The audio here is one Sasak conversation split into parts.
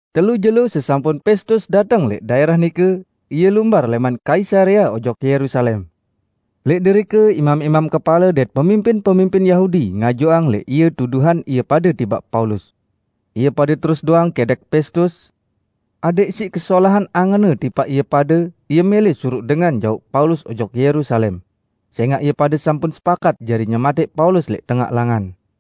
Telu jelo sesampun Pestus dateng lẽq daẽrah nike, ie lumbar lẽman Kaisarea ojok Yerusalem. Lẽq derike imam-imam kepale dait pemimpin-pemimpin Yahudi ngajuang lẽq ie tuduhan ie pade tipaq Paulus. Ie pade terus doang kẽdẽq Pestus adẽq siq kesolahan angenne tipaq ie pade, ie mẽlẽ suruq dengan jauq Paulus ojok Yerusalem; sẽngaq ie pade sampun sepakat jari nyematẽq Paulus lẽq tengaq langan.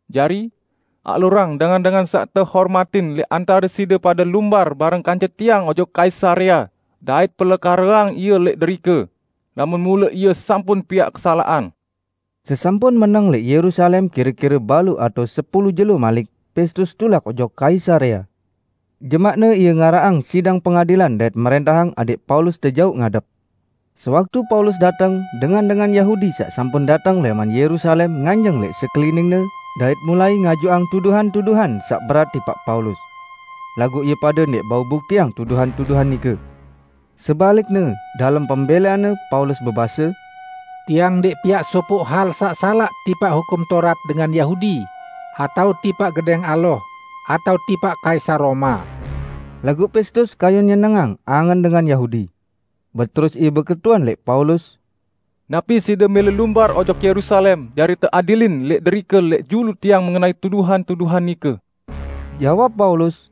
Jari, alurang dengan-dengan saq tehormatin lẽq antare side pade lumbar bareng kance tiang ojok Kaisarea dait pelekareang ie lẽq derike, lamun mule ie sampun piaq kesalaqan." Sesampun meneng lẽq Yerusalem kire-kire baluq atao sepulu jelo malik, Pestus tulak ojok Kaisarea. Jemaqne ie ngaraqang sidang pengadilan dait mrẽntahang adẽq Paulus tejauq ngadep. Sewaktu Paulus dateng, dengan-dengan Yahudi saq sampun dateng lẽman Yerusalem nganjeng lẽq sekeliningne, dait mulai ngajuang tuduhan-tuduhan saq berat tipaq Paulus. Laguq ie pade ndẽq bau buktiang tuduhan-tuduhan nike. Sebalikne, dalem pembẽleanne, Paulus bebase, "Tiang ndẽq piaq sopoq hal saq salaq tipaq Hukum Taurat dengan Yahudi atao tipaq Gedẽng Allah atao tipaq Kaisar Roma." Laguq Pestus kayun nyenengang angen dengan Yahudi. Beterus ie beketuan lẽq Paulus, "Napi side mẽlẽ lumbar ojok Yerusalem jari teadilin lẽq derike lẽq julu tiang mengenai tuduhan-tuduhan nike?" Jawab Paulus,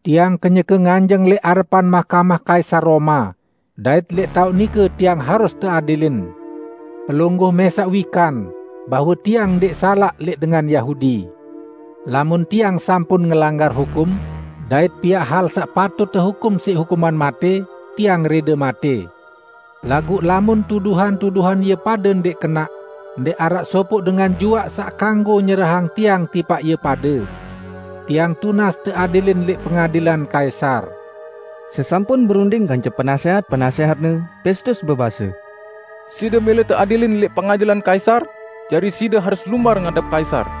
"Tiang kenyeke nganjeng lẽq arepan mahkamah Kaisar Roma; dait lẽq taoq nike tiang harus teadilin. Pelungguh mẽsaq wikan bahwe tiang ndẽq salaq lẽq dengan Yahudi. Lamun tiang sampun ngelanggar hukum dait piaq hal saq patut tehukum siq hukuman matẽ, tiang rẽde matẽ. Laguq lamun tuduhan-tuduhan ie pade ndẽq kenaq, ndẽq araq sopoq dengan juaq saq kanggo nyerahang tiang tipaq ie pade. Tiang tunas teadilin lẽq pengadilan Kaisar!" Sesampun berunding kance penasẽhat-penasẽhatne, Pestus bebase, "Side mẽlẽ teadilin lẽq pengadilan Kaisar, jari side harus lumbar ngadep Kaisar."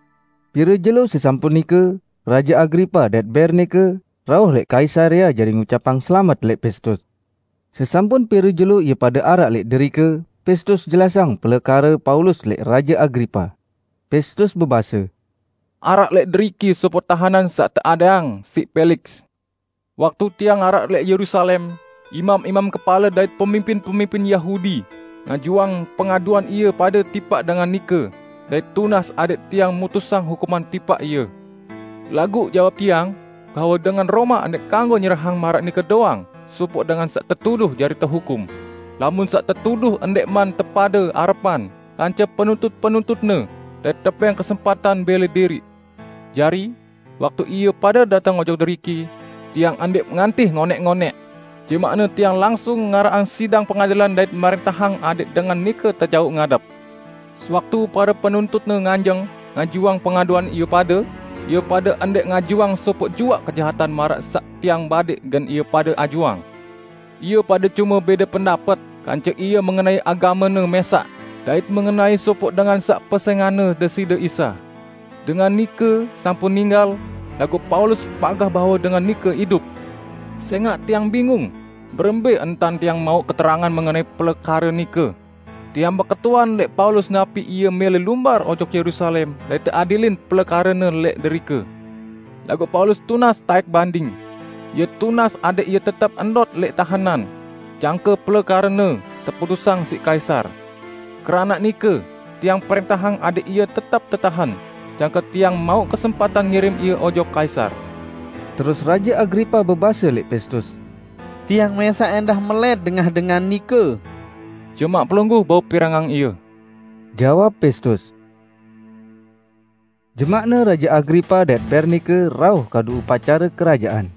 Pire jelo sesampun nike, Raje Agripa dait Bernike rauh lẽq Kaisarea jari ngucapang selamet lẽq Pestus. Sesampun pire jelo ie pade araq lẽq derike, Pestus jelasang pelekare Paulus lẽq Raje Agripa. Pestus bebase, "Araq lẽq deriki sopoq tahenan saq teadẽqang siq Peliks. Waktu tiang araq lẽq Yerusalem, imam-imam kepale dait pemimpin-pemimpin Yahudi ngajuang pengaduan ie pade tipaq dengan nike dait tunas adẽq tiang mutusang hukuman tipaq ie. Laguq jawab tiang bahwe dengan Roma ndẽq kanggo nyerahang maraq nike doang sopoq dengan saq tetuduh jari tehukum, lamun saq tetuduh ndẽqman tepade arepan kance penuntut-penuntutne dait tebẽng kesempatan bẽle diriq. Jari, waktu ie pade dateng ojok deriki, tiang ndẽq ngantih ngonẽq-ngonẽq. Jemaqne tiang langsung ngaraqang sidang pengadilan dait mrẽntahang adẽq dengan nike tejauq ngadep. Sewaktu pare penuntutne nganjeng ngajuang pengaduan ie pade, ie pade ndẽq ngajuang sopoq juaq kejahatan maraq saq tiang badẽq gen ie pade ajuang. Ie pade cume bẽde pendapet kance ie mengenai agamene mẽsaq dait mengenai sopoq dengan saq pesẽnganne Deside Isa. Dengan nike sampun ninggal, laguq Paulus pagah bahwe dengan nike idup. Sẽngaq tiang bingung berembẽ entan tiang mauq keterangan mengenai pelekare nike, tiang beketuan lẽq Paulus napi ie mẽlẽ lumbar ojok Yerusalem dait teadilin pelekarene lẽq derike. Laguq Paulus tunas taẽk banding; ie tunas adẽq ie tetep ndot lẽq tahenan jangke pelekarene teputusang siq Kaisar. Keranaq nike tiang prẽntahang adẽq ie tetep tetahen, jangke tiang mauq kesempatan ngirim ie ojok Kaisar." Terus Raje Agripa bebase lẽq Pestus, "Tiang mẽsaq ẽndah melẽt dengah dengan nike." "Jemaq pelungguh bau pirengang ie," jawab Pestus. Jemaqne Raje Agripa dait Bernike rauh kadu upacare kerajaan.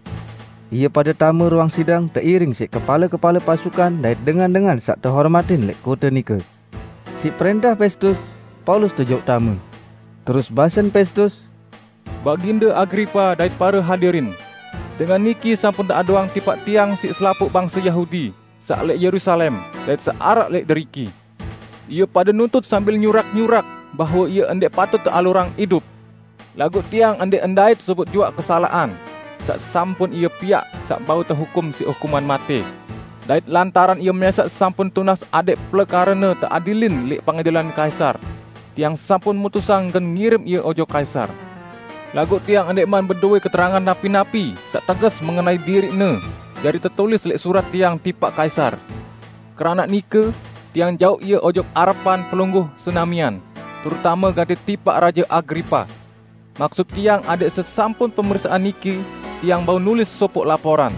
Ie pade tame ruang sidang teiring siq kepale-kepale pasukan dait dengan-dengan saq tehormatin lẽq kote nike. Siq prẽntah Pestus, Paulus tejauq tame. Terus basen Pestus, "Baginde Agripa dait pare hadirin! Dengan niki sampun teaduang tipaq tiang siq selapuq bangse Yahudi, saq lẽq Yerusalem, dait saq araq lẽq deriki. Ie pade nuntut sambil nyurak-nyurak bahwe ie ndẽq patut tealurang idup. Laguq tiang ndẽq ndait sopoq juaq kesalaqan saq sampun ie piaq saq bau tehukum siq hukuman matẽ. Dait lantaran ie mẽsaq sampun tunas adẽq pelekarene teadilin lẽq pengadilan Kaisar, tiang sampun mutusang gen ngirim ie ojok Kaisar. Laguq tiang ndẽqman bedowẽ keterangan napi-napi saq teges mengenai diriqne jari tetulis lẽq surat tiang tipaq Kaisar. Keranaq nike tiang jauq ie ojok arepan pelungguh senamian, terutame gati tipaq Raje Agripa! Maksut tiang adẽq sesampun pemeriksaan niki, tiang bau nulis sopoq laporan.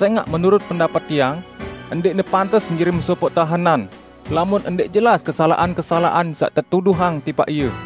Sẽngaq menurut pendapet tiang, ndẽqne pantes ngirim sopoq tahenan lamun ndẽq jelas kesalaqan-kesalaqan saq tetuduhang tipaq ie."